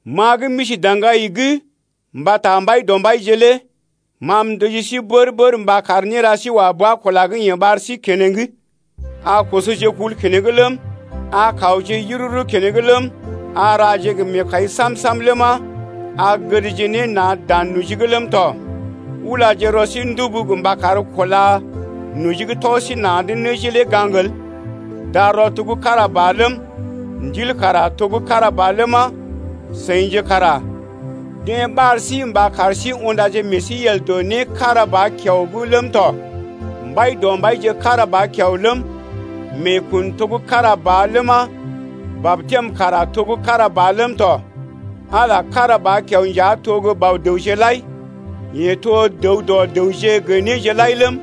Ma gə́ m’isi daŋgai’g mbata Mbaidɔmbaije lé ma m’ndəji sí bər-bər mba kar néra sí wa bua kula gə́ yeḛ ɓar sí keneŋ. A kosoje kul keneŋ ləm, a kawje yururu keneŋ ləm, a raje gə meekai sam-sam ləma, a gədje ne na̰ dan noji’g ləm tɔ. Ulaje rɔ sí ndubu mba kar kúla noji gə́ tɔ sí na̰’d nəji lé gaŋg el. Darɔ to gə́ kára ba ləm, Ndil kara to gə́ kára ba ləma, seḭje kara deḛ ɓar sí mba kar sí undaje meḛ sí yel dɔ né gə́ kára ba kiao’g ləm tɔ. Mbaidɔmbaije kára ba kiao ləm, meekun to gə́ kára ba ləma, batɛm kara to gə́ kára ba ləm tɔ. Ala kára ba kiao nja to gə́ Bɔ-dəwje lai. Yeḛ to dəw dɔ dəwje gə néje lai ləm,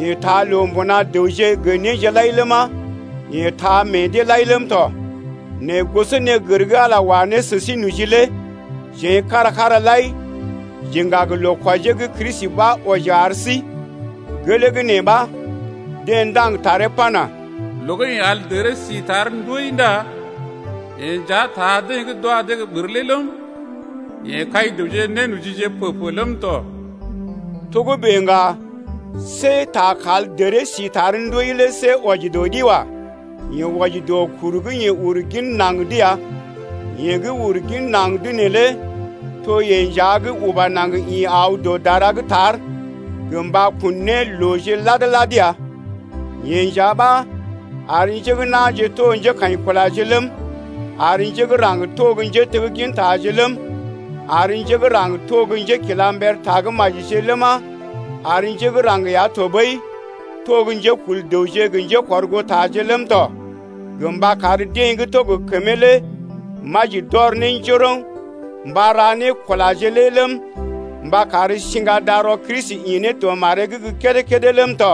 yeḛ taa loo mbuna dəwje gə néje lai ləma, yeḛ taa meḛ deḛ lai ləm tɔ. Nɛ gosonégər gə́ Ala wa ne sə sí noji lé jeḛ kára-kára lai j’iŋga gə loo kwɔjee gə́ Kristi ɓa wɔji ar sí. Gelee gə́ nee ɓa, deḛ ndaŋg taree pana: Loo gə́ yeḛ al dəree si tar ndoi Ndá yeḛ nja taa deḛ gə́ d’wa dee gə́ ɓər lé ləm, Yeḛ kai dəwje nénojije pə-pə ləm tɔ. Togə́bè ŋga, see ta kal dəree si tar ndoi lé see wɔji dɔ ɗi wa. Yee wɔji dɔ kuru gə́ yeḛ uru gin naŋg’d ya. Yeḛ gə́ uru gin naŋg neelé to yeḛ nja gə́ uba naŋg ḭ aw dɔ dara gə́ tar gə mba kun ne looje lad-lad ya. Yeḛ nja ɓa ar njé gə́ na̰je to gə́ njékaḭkulaje ləm, ar njé gə́ raŋg to gə́ njéteggintaje ləm, ar njé gə́ raŋg to gə́ njékilamber tagə́majije ləma, ar njé gə́ raŋg ya ɓəi to gə́ njékul dəwje gə njékɔrgootaje ləm tɔ, gə mba kar deḛ gə́ to gə kəmee lé maji d’ɔr ne njoroŋ mba ra ne kulaje lé ləm, mba kar siŋga darɔ Kristi ḭ ne dɔ maree’g gə́ kédé-kédé ləm tɔ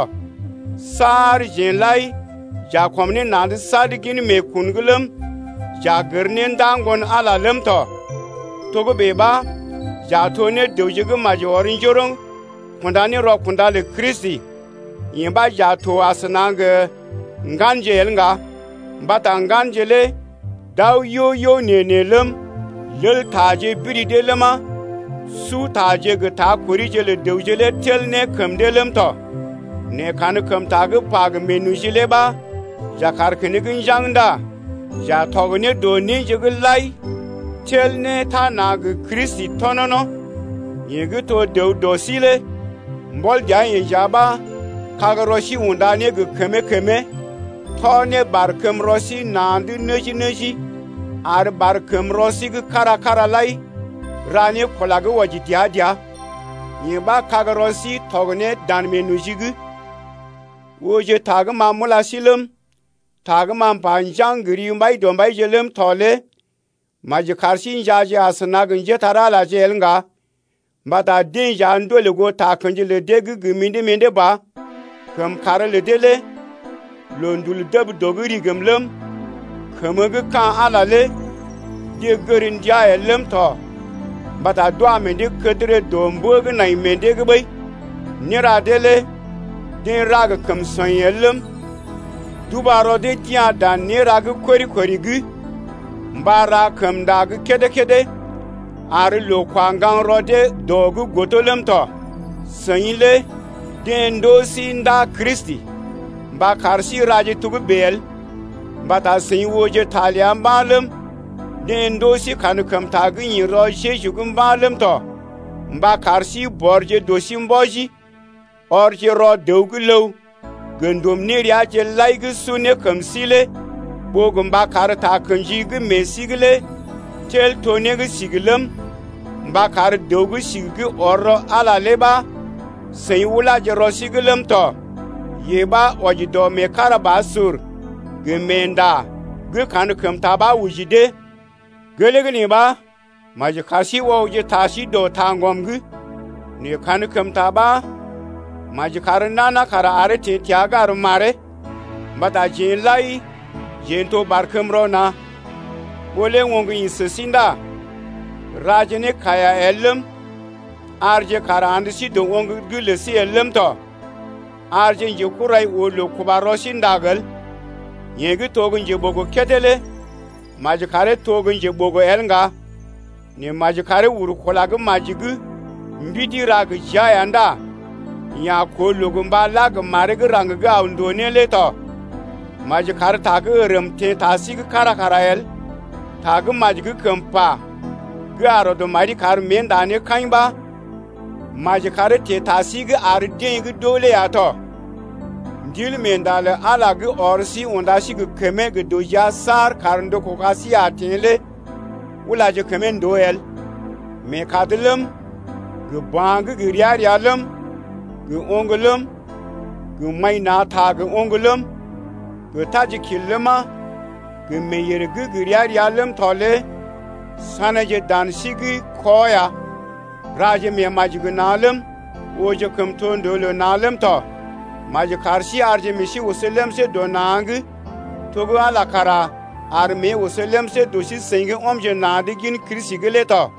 saar jeḛ lai j’a kɔm ne na̰’d sad gin meekun’g ləm, j’a gər ne ndaa Ŋgon-Ala lé ləm tɔ. Togə́bè ɓa j’a to ne dəwje gə́ maji ɔr njoroŋ kunda ne rɔkunda lə Kristi. Yee ɓa j’a to ne asəna gə ŋganje el ŋga, mbata ŋganje lé d’aw yo-yo nee-nee ləm, leltaje biri dee ləma, sutaje gə ta korije lə dəwje lé tel ne kəm dee ləm tɔ. Nɛ kankəmta gə́ pa gə meenoji lé ɓa j’a kaar keneŋ njaŋg ndá j’a tɔg ne dɔ néje’g lai tel ne tana gə Kristi tɔnɔno̰, yeḛ gə́ to dəw dɔ sí lé. Mbɔl dəa-yeḛ nja ɓa kagrɔ sí unda ne gə kəmee-kəmee, tɔ ne barkəmrɔ sí na̰’d nəji-nəji, ar barkəmrɔ sí gə́ kára-kára lai ra ne kula gə́ wɔji dəa-dəa. Yee ɓa kagrɔ sí tɔg ne dan meenoji’g. Ooje ta gə́ ma m’ula sí ləm, ta gə́ m’pa njaŋg gə ri Mbaidɔmbaije ləm tɔ lé maji kar sí njaaje asəna gə njépole-magəje el ŋga mbata deḛ nja ndolè goo takə̰ji lə deḛ gə́ gə mḭdé-mḭdé ba. Kəmkàr lə dee lé loondul dəb dɔ’g rigim ləm, kəmə gə́ ka̰ Ala lé deḛ gər ndiaa el ləm tɔ mbata d’wa meḛ dee kədərə dɔ mbə gə́ nai meḛ dee’g ɓəi. Néra dee lé deḛ ra gə kəm sɔḭ el ləm, d’uba rɔ dee d’ya̰ dan néra gə́ kori-kori’g mba ra kəmnda gə́ kédé-kédé ar loo kwa ŋgaŋ rɔ dee dɔ’g godo ləm tɔ. Seḭ lé deḛ ndoo sí ndaa Kristi mba kar sí raje togə́bè el, mbata seḭ ooje ta ləa mba̰ ləm, deḛ ndoo sí kankəmta gə́ ḭ rɔ Jeju’g mba̰ ləm tɔ mba kar sí bɔrje dɔ sí mbɔji, ɔrje rɔ dəw gə́ ləw gə ndum néreaje lai gə́ su ne kəm sí lé ɓó gə mba kar takə̰ji gə́ meḛ sí’g lé tel to ne sigi ləm, mba kar dəw gə́ sigi gə́ ɔr rɔ Ala ɓa seḭ ulaje rɔ sí’g ləm tɔ, yee ɓa wɔji dɔ meekarabasur gə meenda gə́ kankəmta ɓa oji dee. Gelee gə́ nee ɓa, maji kar sí ɔgje ta sí dɔ taŋgɔm’g. Nɛ kankəmta ɓa, maji kar nana kara aree teḛ təa’g ar maree, mbata jeḛ lai jeḛ n’toje barkəmrɔ na̰. Ɓó lé oŋg ḭ sə sí ndá raje ne kaiya el ləm, arje kàr andə sí dɔ oŋg’g lə sí el ləm tɔ. Arje njekurai oo loo kuba rɔ sí ndag el. Yeḛ gə́ to gə́ njeɓogo kédé lé maji karee to gə́ njeɓogo el ŋga, nɛ maji karee uru kula gə́ maji’g mbidi ra gə jia ya ndá yeḛ a koo loo gə mba la gə maree gə́ raŋg gə́ aw ndòo né lé tɔ. Maji kar ta gə́ ərm teḛ ta sí’g kára kara el, ta gə́ maji gə́ kəm pa gə́ a rɔd mari kar mée nda ne kaḭ ɓa maji karee teḛ ta sí’g ar deḛ gə́ d’oo lé ya tɔ. Ndilmeenda lə Ala gə́ ɔr sí unda sí gə kəmee gə dɔ jia saar kar ndɔ kuga sí a teḛ lé ulaje kəmee ndòo el. Meekad ləm, gə ba̰ gə́ gə ria-ria ləm, gə oŋg ləm, gə kɔl na̰ gə oŋg ləm, gə tajikil ləma, gə meeyèr gə́ gə ria-ria ləm tɔ lé saneeje dan sí’g kɔ ya. Raje meemaji gə na̰ ləm, ooje kəmtondoo lə na̰ ləm tɔ. Maji kar sí arje meḛ sí oso lemsé dɔ na̰’g to gə́ Ala kara ar mée oso lemsé dɔ sí-seḭ gə́ ɔmje na̰’d gin Kristi’g lé tɔ.